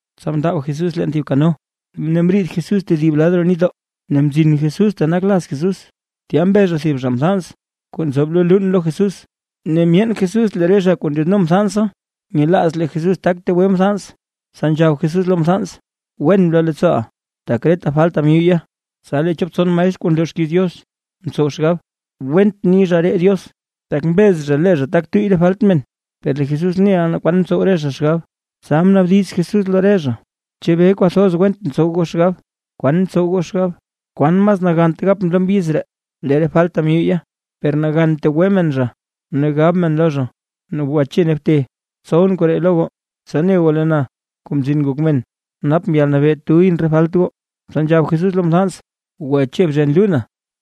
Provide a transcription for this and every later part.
Tsa mndaab Jesús leen thib kano, ne mriid Jesús tedib lad roo nitdoo, ne mzin Jesús ta nak laz Jesús. Tya mbe zha thib zha mthans kuu nzoob lo luun lo Jesús. Ne myeen Jesús lee re zha kuu ndyaadno mthansa, nyelaaz lee Jesús tak tegwe mthans, tsa nzhab Jesús lo mthans: ―Wen bloo leettsooʼa; tak reta falta myuyya. Tsa lee chop tson maestr kuu nloo xkiiz Diox mtsow xgab: “Went ni zha ree Diox, tak mbez zha lee zha tak tuyy re falt men”. Per lee Jesús neʼa naa kwan ntsow re zha xgab, tsa mnaabdiz Jesús lo re zha: ―¿Chebee kwathoz went ntsow goo xgab? ¿Kwan ntsow goo xgab? ¿Kwan mas nagant gap na lo mbyiz ree: “Lee re falta myuyya”, per nagan tegwe men zha ne gab men lo zha, “Gwache ne bte”? Tsowʼn koree lo goo, tsa ne goo lee na, Kuu Mzin Ngok Men, napʼn yalnabee tuyʼn re falt goo. Tsa nzhab Jesús lo mthans: ―Gwache bzhen luuna,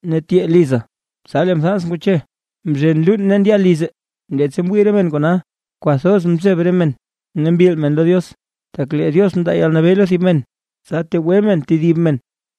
ne tyee liza. Tsa lee mthans ngwache mzhen luun ne ndya lize. Leettsa mwii re men kona, kwathoz mzeb re men ne mbil men lo Diox, tak lee Diox mndaa yalnabee lo thib men, tsa tegwe men tedib men.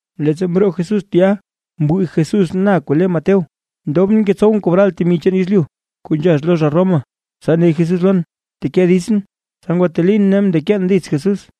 Leettsa mroo Jesús tya mwii Jesús na kuu le Mateo, ndobʼn ngetsowʼn kobral temi chaan yezlyu kuu nzhax lo zha Roma, tsa ne Jesús lon: ―Bteke ditsʼn. Tsa ngwatelin ne mndekeen dits Jesús.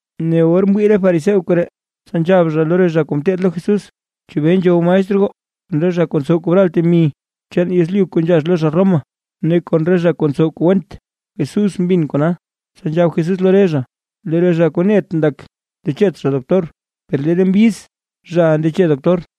Ne or mwii re fariseo koree, tsa nzhab zha lo re zha kuu ngeteed lo Jesús: ―¿Chebee nzhow maestr goo, kon re zha kuu ntsow kobral temi chaan yezlyu kuu nzhax lo zha Roma, ne kon re zha kuu ntsow kuu went? Jesús mbin kona, tsa nzhab Jesús lo re zha: ―Lee re zha kuu net ndak, ndechet zha doctor, per lee re mbyiz, zhaʼa ndeche doctor.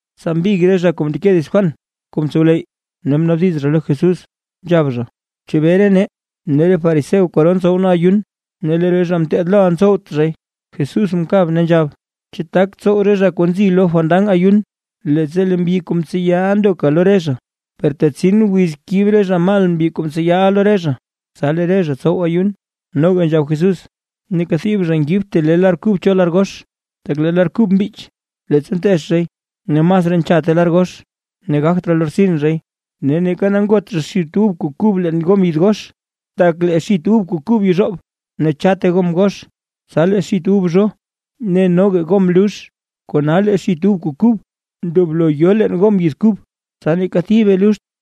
Tsa mbig re zha kuu mndeke dits Juan kuu mtsowleyy, ne mnaabdiz zha lo Jesús, nzhab zha: ―¿Chebee re nee, ne re fariseo kwaro ntsow nee ayun, ne lee re zha kuu ngeteed loʼa ntsowt zhay? Jesús mkab, ne nzhab: ―¿Chu tak tsow re zha kuu nzi lo fandan ayun, leettsa lee mbyi kuu mtseyaʼa ndoka lo re zha? Per tetsin wiz kib re zha mal mbyi kuu mtseyaʼa lo re zha; tsasi lee re zha tsow ayun. Noga nzhab Jesús: ―Neeka thib zha ngibt thib le lar kub cho lar gox, tak lee lar kub mbich, leettsa nteech zhay ne masraa nchatte lar gox ne gagt raa lortsin zhay. Ne neeka ngot zha xit ub kuu kub leen gom yid gox, tak lee xit ub kuu kub yezhoob, ne chatte gom gox. Tsa lee xit ub zho, ne noga gom lux. Kona lee xit ub kuu kub ndoblo yo leen gom yid kub tsa neeka thibe luxt.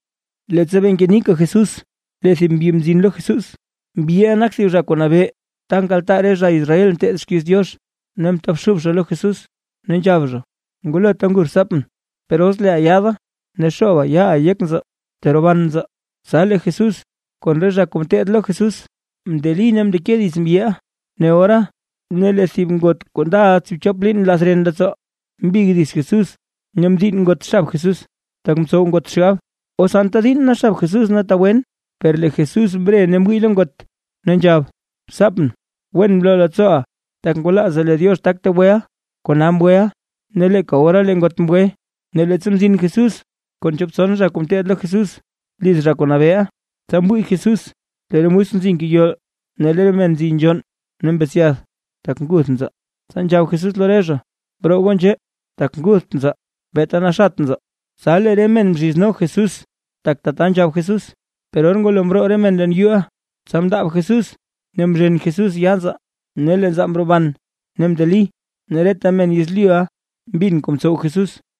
Leettsa bee ngenika Jesús lee thib mbyi mzin lo Jesús, mbyiʼa nak thib zha kuu nabee ta nkaltaa re zha Israel nteed xkiiz Diox, ne mtobxub zha lo Jesús ne nzhab zha: ―Ngulota nguth rtsaapʼn; per os leeʼa yaada ne xooba yaaʼa yek nzaa teroban nzaa. Tsa lee Jesús kon re zha kuu ngeteed lo Jesús mndeli ne mndeke dits mbyiʼa. Ne ora lee thib ngot kuu ndaʼa tsiibchop liin nlath ren leettsoo, mbig dits Jesús ne mdiinn ngot xab Jesús. Tak mtsow ngot xgab: “Os anta diinn na xab Jesús tegwen”. Per lee Jesús mre ne mwii lo ngot, ne nzhab: ―Rtsaapʼn. Wen bloo leettsooʼa, tak ngwalaaza lee Diox tak tegweʼa, kona mgweʼa. Ne leeka ora lee ngot mgwe. Ne leettsa mzin Jesús kon chop tson zha kuu ngeteed lo Jesús liz zha kuu nabeeʼa, tsa mwii Jesús lee re musk nzi ngeyol, ne lee re men nzi nzhonn ne mbetsyath tak nguth nzaa. Tsa nzhab Jesús lo re zha: ―Broo goo nzhee, tak ngutht nzaa, beeta naxat nzaa. Tsa lee re men mzhizno Jesús, tak tata nzhab Jesús. Per or ngwalo mroo re men leen yuu, tsa mndaab Jesús ne mzhen Jesús yaa nzaa, ne lee nzaa mroban ne mndeli. Ne reta men yezlyuʼa mbin kuu mtsow Jesús.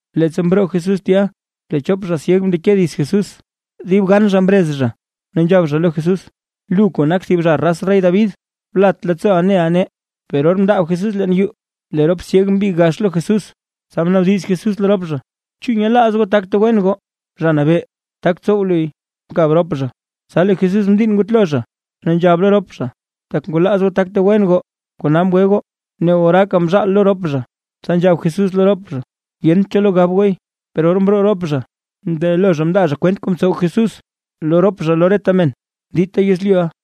Leettsa mroo Jesús tya, lee chop zha syeg mndeke dits Jesús, dib gan zha mrez zha ne nzhab zha lo Jesús: ―¡Lu kuu nak thib zha raz rey David, blat leettsooʼa neʼa nee! Per or mndaab Jesús leen yuu, lee rop syeg mbig gax lo Jesús, tsa mnaabdiz Jesús lo rop zha: ―¿Chu nyelaaz goo tak tegwen goo? ―Zha Nabee, tak tsow luy ― mkab rop zha. Tsa lee Jesús mdiinn ngutlo zha, ne nzhab lo rop zha: ―Tak ngwalaaz goo tak tegwen goo, kona mgwe goo. Ne oraaka mzaal lo rop zha, tsa nzhab Jesús lo rop zha: ―Yent cho lo gab gooy. Per or mroo rop zha, mndelo zha mndaa zha kwent kuu mtsow Jesús lo rop zha, lo reta men dita yezlyuʼa.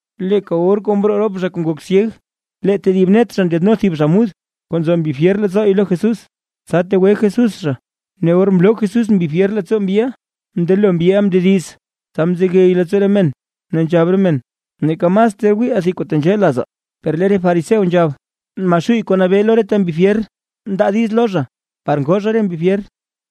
Leeka or kuu mroo rop zha kuu ngok syeg, lee tedib net zha ndyaadno thib zha mud kuu nzo mbi fyer leettsoo lo Jesús, tsa tegwe Jesús zha. Ne or mloo Jesús mbi fyer leettsoo mbyiʼa, mndelo mbyiʼa mndediz. Tsa mzegey leettsoo re men, ne nzhab re men: ―¡Neeka mas ter wiiʼaa thib kuu tenzhee lazaa! Per lee re fariseo nzhab: ―Maxuuy kuu nabee lo reta mbi fyer, mndaa diiz lo zha par ngoo zha re mbi fyer.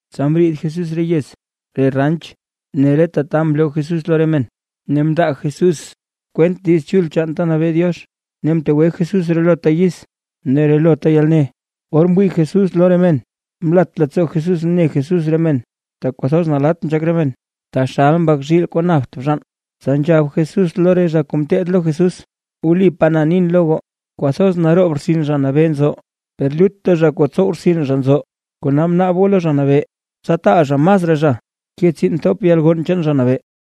Tsa mriid Jesús re yez ne re ranch ne reta ta mloo Jesús lo re men, ne mndaa Jesús kwent Diiz Chul chaan ta nabee Diox ne mtegwe Jesús relota yiz ne relota yalne. Or mwii Jesús lo re men mlat leettsoo Jesús ne Jesús re men, tak kwathoz nalatt nzhak re men, taxal mbak zhiil kuu napt bzhaan. Tsa nzhab Jesús lo re zha kuu ngeteed lo Jesús: ―Wlipaa na nin lo goo, kwathoz naroob rtsin Zha Nabee nzo, per lutta zha kuu ntsow rtsin zha nzo. Kona bnaab goo lo Zha Nabee, tsa taal zha masraa zha ke tsiin thop yalgonn chaan Zha Nabee.